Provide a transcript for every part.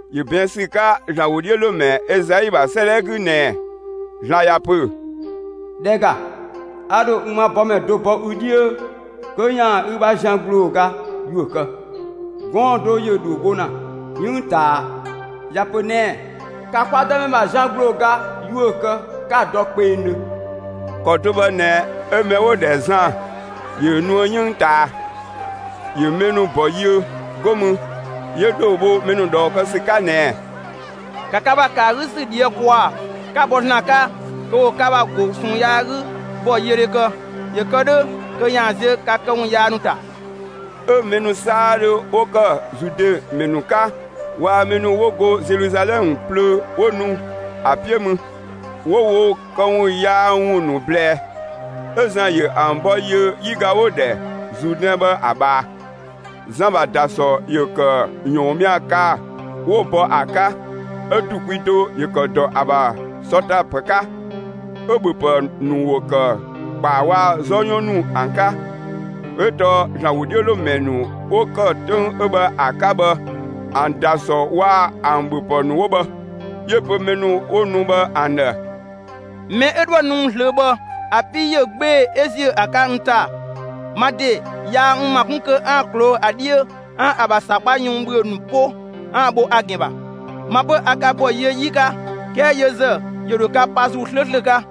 ‑Yö ꞊bɛɛn' ‑sü 'ka ‑Zlan ‑wodhiölomɛ Ezai ‑bha 'sëëdhɛ 'gü ꞊nɛɛ: ‑Zlan ‑ya ‑pö: ‑Dhɛ ‑ga, a ‑dho n ‑ma bɔmɛ do bɔ ü 'dhiö, kö ‑yaan ü ‑bha zian ‑gblooga ‑yuö kë. Gɔɔn‑ do ‑yö ‑dhoo bho ‑na 'yënng ꞊taa, ‑ya ‑pö ꞊nɛɛ: ‑Ka kwa Dëmɛ ‑bha zian ‑gblooga ‑yuö kë, 'ka‑ dɔ kpengdhö! ‑Kɔ do bhë ꞊nɛ 'ö mɛ 'wo‑ ‑dhɛ Zan ‑yö nuë 'yënng ꞊taa. ‑Yö mɛ ‑nu ‑bɔ yiö, 'go mü 'yö ‑dhoo bho mɛ ‑nu ꞊dhɔɔ kë ‑sü 'ka ꞊nɛɛ: «‑Ka ka ‑bha ‑kë ‑a 'gü ‑sü ꞊dhië' ‑kwaa, 'ka bɔ ‑Zlan 'ka kö ‑wo ka ‑bha ‑go ꞊sɔɔn yaa 'gü bɔyiödhe kë! ‑Yö kë 'dhö kö ‑yaan ziö ka këwun yaa ‑nu ‑ta!» 'Ö mɛ ‑nu 'saadhö 'wo ‑kë Zude ‑mɛ ‑nu 'ka waa‑ mɛ ‑nu 'wo go Zeluzalɛmë plöö 'wo ‑nu ‑a 'piö mü, 'wo wo këwun yaa ‑wun ‑nu ꞊blɛɛ. 'Ö Zan ‑yö ‑an ‑bɔ yiö 'yiga 'wo‑ ‑dhɛ Zuudɛn bhë ‑a ꞊bhaa. Zan ‑bha ‑dasɔ ‑yö ‑kë ‑yɔɔnmia kaa‑ 'wo‑ bɔ ‑a 'ka, 'ö‑ ‑du kwi do ‑yö ‑kë ‑dɔ ‑a ‑bha sɔ ‑ta ‑pë 'ka, 'ö‑ ‑bhöpë ‑nu ‑wo ‑kë ‑kpaa waa‑ 'zɔ 'yɔn ‑nu ‑an 'ka. ('Ö tɔɔ ‑Zlan ‑wodhiölomɛ ‑nu 'wo ‑kë 'töng 'ö bhë ‑a 'ka bhë ‑an ‑da ‑sɔ waa‑ ‑an ‑bhöpë ‑nu 'wo bhë). 'Yö‑ pö mɛ ‑nu 'wo nu bhë ‑an ‑dhë: «Mɛ 'ö 'dhoë‑ nu n ꞊zlöö bhë ‑a 'pii ꞊yö 'gbee‑ 'ö ‑ziö ‑a 'ka n ‑ta. Ma ‑de yaa n ‑ma 'kun kö 'aan‑ ꞊kloo'‑ ‑a 'dhiö 'aan‑ ‑a ‑bha ‑sakpa yun ‑bhüö ‑nu 'po 'aan‑ bho ‑a ‑gɛn ‑bha. Ma 'pö a ka ‑bɔ yiö 'yi 'ka, 'kɛɛ yö ‑zë ‑yö ‑dho ka pa ‑Zuu 'slööslö 'ka.»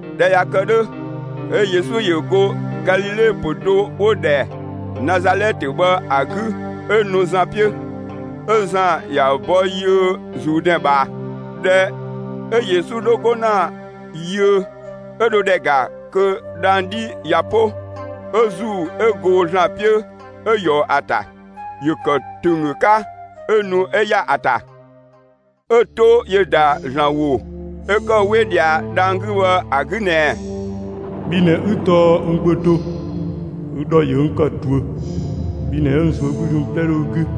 ꞊Dhɛ ꞊ya kë 'dhö, 'ö Yesu ‑yö go Galile pö‑ do 'wo‑ ‑dhɛ Nazalɛtë bhë ‑a 'gü 'ö nu Zan 'piö. 'Ö Zan ‑ya ‑bɔ yiö Zuudɛn ꞊bhaa. ꞊Dhɛ 'ö Yesu 'dho 'go ‑na yiö, 'ö dho ‑dhɛ ‑ga kö dhang‑ 'dhi ꞊ya 'po 'ö ‑Zuu 'ö go ‑Zlan 'piö 'ö ꞊yɔɔ ‑a ‑ta; ‑yö ‑kë ‑tönggö 'ka 'ö nu 'ö ‑ya ‑a ‑ta. 'Ö‑ 'to ‑yö ‑da ‑Zlan ‑wo 'ö ‑kë 'we ꞊dhia dhang‑ 'gü bhë ‑a 'gü ꞊nɛɛ: «Bhi ꞊nɛ 'ü tɔɔ n Gbö do; ü ‑dhɔ ‑yö n ‑kë ꞊duö. Bhi ꞊nɛ 'ö n ꞊zuögludhi ‑wun 'plɛ 'dhö ü 'gü.»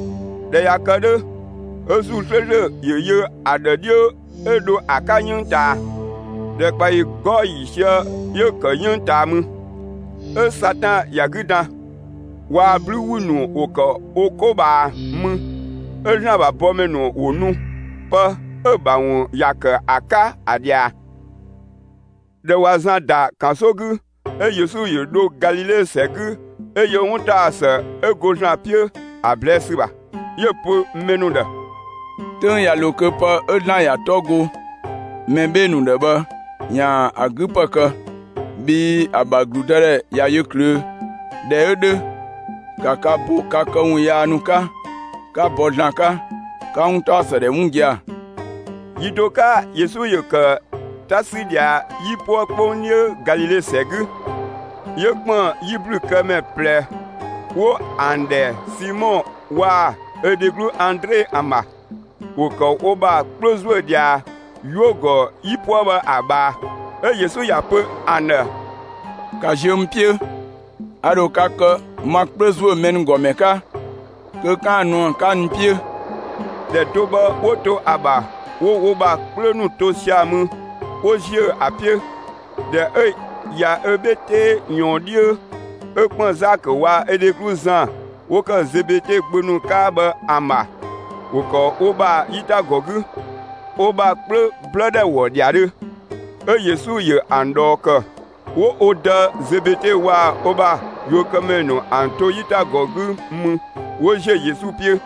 ꞊Dhɛ ꞊ya kë 'dhö, 'ö ‑Zuu 'slööslö ‑yö yö ‑a ‑dhë 'dhiö 'ö dho ‑a 'ka 'yënng ꞊taa. ‑Dhɛkpaɔyi 'gɔɔ‑ ‑yiisië 'yö‑ ‑kë 'yënng ꞊taa mü. 'Ö Satan ‑ya 'gü dan. Waa‑ 'blü ‑wü ‑nu ‑wo ‑kë wo 'ko ꞊bhaa mü. 'Ö ‑Zlan ‑bha bɔmɛ ‑nu ‑wo nu, pë 'ö‑ ‑bha ‑wun ‑ya ‑kë ‑a 'ka, ‑a ꞊dhia. ꞊Dhɛ ꞊wa Zan ‑da ‑kanso 'gü, 'ö Yesu ‑yö dho Galile ‑sɛ 'gü 'ö yö 'wuntaɔsë 'ö go ‑Zlan 'piö ‑a ꞊blɛɛ' ‑sü ‑bha. 'Yö‑ pö mɛ ‑nu ‑dhë: «'Töng ꞊ya ‑lo kö pë 'ö ‑Zlan ‑ya 'tɔ go mɛ 'bhee‑ ‑nu ‑dhë bhë ‑yaan ‑a 'gü ‑pë kë; bhii ‑a ‑bha ‑gludëdhɛ ꞊ya yö ꞊klöö'. ꞊Dhɛ 'ö 'dhö, ‑ka ka bo ka këwun yaa ‑nu 'ka, ('ka bɔ ‑Zlan 'ka,) 'ka 'wuntaɔsë ‑wun ‑dhɛ 'wun gia‑!» Yi do 'ka kö Yesu ‑yö ‑kë 'ta 'sü ꞊dhia 'yipuë 'kpong 'dhiö Galile ‑sɛ 'gü, 'yö ‑kpën 'yiblükëmɛ ꞊plɛ 'wo ‑an ‑dhɛ Simɔ waa‑ ö dheglu Andre ‑an ‑bha. ‑Wo ‑kë wo ‑bha 'kplö ‑zuö ꞊dhia 'yuö‑ ‑gɔ 'yipuë bhë ‑a ꞊bhaa. 'Ö Yesu ‑ya pö ‑an ‑dhë: «‑Ka ziö n 'piö, a ‑dho ka kë ma 'kplö ‑zuö mɛ ‑nu ‑gɔ ‑mɛ 'ka kö 'kaan‑ nu ‑an 'ka n 'piö.» ‑Dhɛ do bhë 'wo to ‑a ‑bha 'wo wo ‑bha 'kplö ‑nu to sia‑ mü 'wo ‑ziö ‑a 'piö. ꞊Dhɛ 'ö ꞊ya ö 'bhe 'tee ꞊yɔɔn 'dhiö, 'ö ‑kpën Zakö waa‑ ö dheglu Zan 'wo ‑kë Zebede gbö nu 'ka bhë ‑an ‑bha. ‑Wo ‑kë wo ‑bha 'yitagɔ 'gü, wo ‑bha 'kplö 'blë ‑dhɛ ‑wɔ ‑dhiadhö. 'Ö Yesu ‑yö ‑an ꞊dhɔɔ ‑kë. 'Wo wo dë Zebede waa‑ ö ‑bha yuökëmɛ ‑nu ‑an to 'yitagɔ 'gü mü 'wo ‑ziö Yesu 'piö.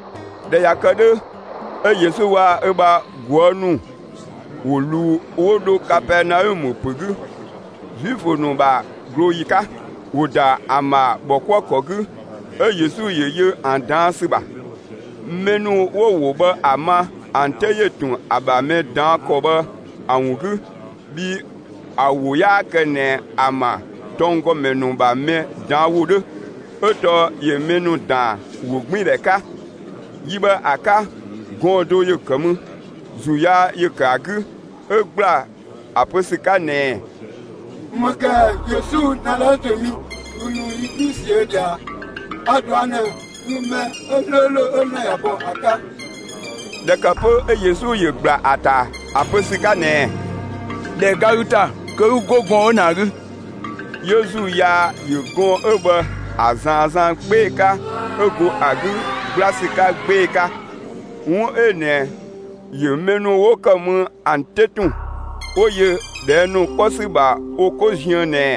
꞊Dhɛ ꞊ya kë 'dhö, 'ö Yesu waa‑ ö ‑bha ꞊guë' ‑nu ‑wo ‑luu 'wo dho Kapɛɛnaɔmë ‑pö 'gü. Zuifö ‑nu ‑bha ꞊glooyi 'ka, ‑wo ‑da ‑an ‑bha ‑bhɔkuëkɔ 'gü, 'ö Yesu ‑yö yö ‑an ꞊daan' ‑sü ‑bha. Mɛ ‑nu 'wo‑ ‑wo bhë ‑a ma, ‑an 'te ‑yö ‑tun ‑a ‑bha mɛ ꞊daan' ‑kɔ bhë ‑a ‑wun 'gü. Bhii ‑a ‑wo 'yaa kë ꞊nɛ ‑an ‑bha tɔnggɔmɛ ‑nu ‑bha mɛ ꞊daan' ‑wo 'dhö, 'ö tɔɔ ‑yö mɛ ‑nu ‑daan ‑wogbiindhɛ 'ka. Yi bhë ‑a 'ka gɔɔn‑ do ‑yö ‑kë mü; ‑zuu yaa ‑yö ‑kë ‑a 'gü, 'ö ‑gbla ‑a pö ‑sü 'ka ꞊nɛɛ: «‑Më ‑kë ‑ɛ? Yesu, Nazalɛtë mi, ü ‑nu yi 'gü ꞊siö' ꞊dhia ꞊a? A‑ ꞊dɔa' ꞊nɛ, ü mɛ 'slööslö 'ö ‑Zlan ‑ya bɔ ‑a 'ka!» ꞊Dhɛ ‑kë 'pö 'ö Yesu ‑yö ‑gbla ‑a ‑ta, ‑a pö ‑sü 'ka ꞊nɛɛ: «‑Dhɛ ga ü ‑ta kö 'ü 'go gɔɔn‑ 'ö ꞊nɛ ‑a 'gü!» 'Yö ‑zuu yaa ‑yö gɔɔn‑ 'ö bhë ‑a ꞊zaan 'zan 'gbee‑ 'ka 'ö go ‑a 'gü ‑gbla ‑sü 'ka 'gbee‑ 'ka. 'Wun 'ö ꞊nɛ ‑yö mɛ ‑nu 'wo ‑kë mü ‑an 'te ‑tun 'wo yö ꞊dhɛɛ' ‑nu 'kpɔ ‑sü ‑bha wo 'ko ziën ꞊nɛɛ: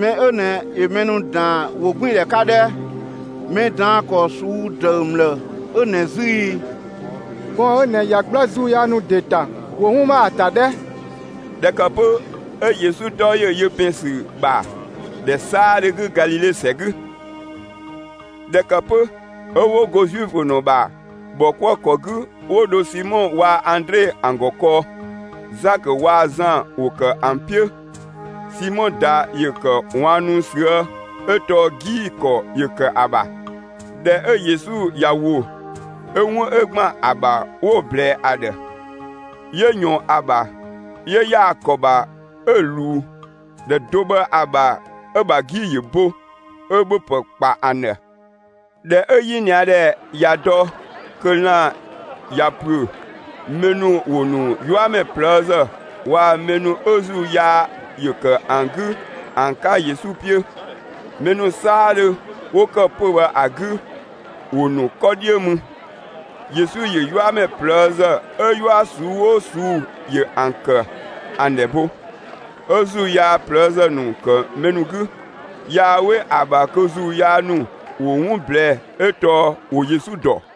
«Mɛ 'ö ꞊nɛ ‑yö mɛ ‑nu ‑daan ‑wogbiindhɛ 'ka 'dhɛ! Mɛ ꞊daan' ‑kɔ ꞊suu'‑ ‑dëü ‑mlë 'ö ꞊nɛ 'zü ‑i! Gɔɔn‑ 'ö ꞊nɛ ꞊ya 'gbla ‑zuu yaa ‑nu ‑de ‑ta, ‑wo 'wun ma ‑a ‑ta 'dhɛ!» ꞊Dhɛ ‑kë 'pö 'ö Yesu 'tɔ ‑yö yö ‑pɛn ‑sü ‑bha ‑dhɛ 'saadhö 'gü Galile ‑sɛ 'gü. ꞊Dhɛ ‑kë 'pö 'ö 'wo go Zuifö ‑nu ‑bha ‑bhɔkuëkɔ 'gü, 'wo dho Simɔ waa‑ Andre ‑an ‑gɔ kɔɔ. Zakö waa‑ Zan ‑wo ‑kë ‑an 'piö. Simɔ ꞊da ‑yö ‑kë ꞊waannu ꞊süë' 'ö tɔɔ 'gii‑ ‑kɔ ‑yö ‑kë ‑a ‑bha. ꞊Dhɛ 'ö Yesu ꞊ya ‑wo, 'ö 'wun 'ö ‑gban ‑a ‑bha, 'wo‑ ꞊blɛɛ ‑a ‑dhë. 'Yö ꞊yɔɔn ‑a ‑bha, 'yö ‑yaa ‑kɔ ‑bha 'ö‑ ꞊luu. ‑Dhɛ do bhë ‑a ‑bha 'ö‑ ‑bha 'gii‑ ‑yö bo, 'ö ‑bhöpë ‑kpa ‑an ‑dhë. ꞊Dhɛ 'ö 'yinia ‑dhɛ ꞊ya dɔ kö lan‑ ꞊ya ‑püö, mɛ ‑nu ‑wo ‑nu 'yuamɛ ꞊plëëzë waa‑ mɛ ‑nu 'ö ‑zuu yaa ‑yö ‑kë ‑an 'gü ‑an 'ka Yesu 'piö. Mɛ ‑nu 'saadhö 'wo ‑kë pö‑ bhë ‑a 'gü, ‑wo ‑nu 'kɔ 'dhiö mü. Yesu ‑yö 'yuamɛ ꞊plëëzë 'ö 'yua ꞊suu'‑ 'oo ꞊suu'‑ ‑yö ‑an ‑kë, ‑an ‑dhɛ bo. 'Ö ‑zuu yaa ꞊plëëzë ‑nu ‑kë mɛ ‑nu 'gü. Yaa 'we ‑a ‑bha kö ‑zuu yaa ‑nu ‑wo 'wun ꞊blɛɛ'‑, 'ö tɔɔ ‑wo Yesu dɔ.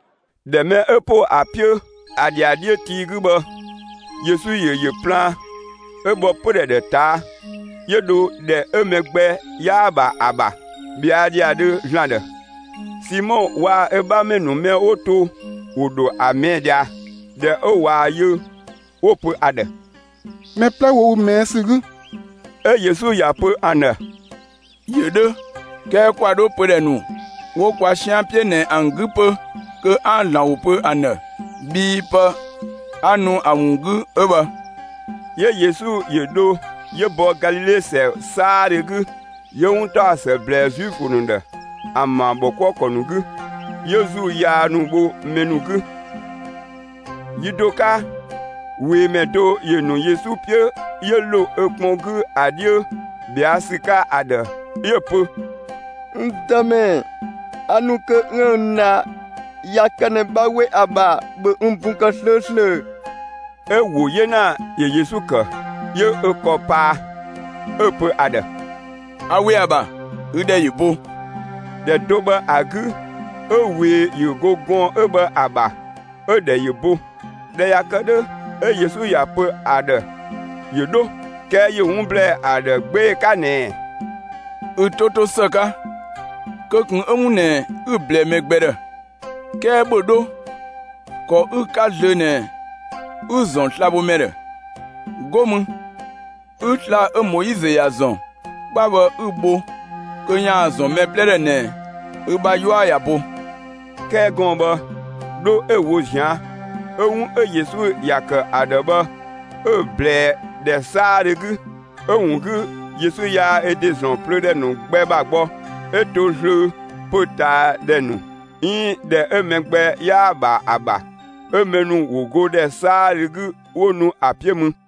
‑Dhɛ mɛ 'ö ‑po ‑a 'piö ‑a ‑dhiadhiö tii 'gü bhë, Yesu ‑yö ‑yö plaan, 'ö bhɔ pödhɛ ‑dhë ꞊taa', 'yö dho ‑dhɛ 'ö mɛ gbɛ 'yaa‑ ‑bha ‑a ‑bha, ꞊bhɛa' ‑dhiadhö ‑Zlan ‑dhë. Simɔ waa‑ ö 'bhamɛ ‑nu mɛ 'wo to, ‑wo ‑dho ‑a ꞊mɛɛ' ꞊dhia. ꞊Dhɛ 'ö ꞊waa‑ yö, 'wo‑ pö ‑a ‑dhë: «Mɛ 'plɛ ‑wo ü ꞊mɛɛ' ‑sü 'gü.» 'Ö Yesu ‑ya pö ‑an ‑dhë: «‑Yö 'dhö; 'kɛɛ ‑kwa 'dho pödhɛ ‑nu 'wo kwa 'sian 'piö ꞊nɛ ‑an 'gü 'pö kö 'aan‑ ‑Zlan ‑wo pö ‑an ‑dhë, bhii pë 'a nu ‑a ‑wun 'gü 'ö bhë.» 'Yö Yesu ‑yö dho 'yö bɔ Galile ‑sɛ 'saadhö 'gü, 'yö 'wuntaɔsë ‑blɛɛ Zuifö ‑nu ‑dhë, ‑an ‑bha ‑bhɔkuëkɔ ‑nu 'gü, 'yö ‑zuu yaa ‑nu bho mɛ ‑nu 'gü. Yi do 'ka ꞊weemɛ do ‑yö ‑nu Yesu 'piö 'yö ‑lo ö kpɔn 'gü ‑a 'dhiö ꞊bhɛa' ‑sü 'ka ‑a ‑dhë, 'yö‑ pö: «N Dëmɛ, a ‑nu kö 'üën‑ n dha. ꞊Ya kë ꞊nɛ 'bha 'we ‑a ‑bha, ‑bhö n bun kë 'slööslö!» 'Ö‑ ‑wo 'yena ‑yö Yesu ‑kë, 'yö ö ‑kɔ paa, 'ö‑ pö ‑a ‑dhë: «A ‑we ‑a ‑bha, ü ‑dhɛ ‑yö bo!» ‑Dhɛ do bhë ‑a 'gü 'ö ꞊wee ‑yö go gɔɔn‑ 'ö bhë ‑a ‑bha, 'ö‑ ‑dhɛ ‑yö bo. ꞊Dhɛ ꞊ya kë 'dhö, 'ö Yesu ꞊ya pö ‑a ‑dhë ‑yö 'dho. 'Kɛɛ ‑yö 'wun ‑blɛɛ ‑a ‑dhë 'gbee‑ 'ka ꞊nɛɛ: «Ü 'to 'to ‑së 'ka: Kö ꞊kun 'ö 'wun ꞊nɛ 'ü‑ ꞊blɛɛ mɛ gbɛ ‑dhë, 'kɛɛ ‑bhö 'dho, ‑kɔ 'ü‑ 'ka zlöö ꞊nɛ 'ü‑ ‑zɔn slabhomɛ ‑dhë! 'Go mü 'ü sla‑ 'ö Moizö ‑ya ‑zɔn 'kpa bhë 'ü‑ bho kö ‑yaan ‑zɔn mɛ 'plɛ ‑dhë ꞊nɛ ü bha 'yua ꞊ya bo.» 'Kɛɛ gɔɔn‑ bhë, 'dho 'ö‑ wo ꞊zian', 'ö 'wun 'ö Yesu ‑ya ‑kë ‑a ‑dhë bhë 'ö‑ ꞊blɛɛ ‑dhɛ 'saadhö 'gü. 'Ö‑ ‑wun 'gü Yesu yaa ö ‑de ‑zɔn plöö ‑dhɛ ‑nu gbɛ ‑bha gbɔ, 'ö to zlöö pö‑ ꞊taa ‑dhɛ ‑nu 'iin ‑dhɛ 'ö mɛ gbɛ 'yaa‑ ‑bha ‑a ‑bha. 'Ö mɛ ‑nu ‑wo go ‑dhɛ 'saadhö 'gü 'wo nu ‑a 'piö mü.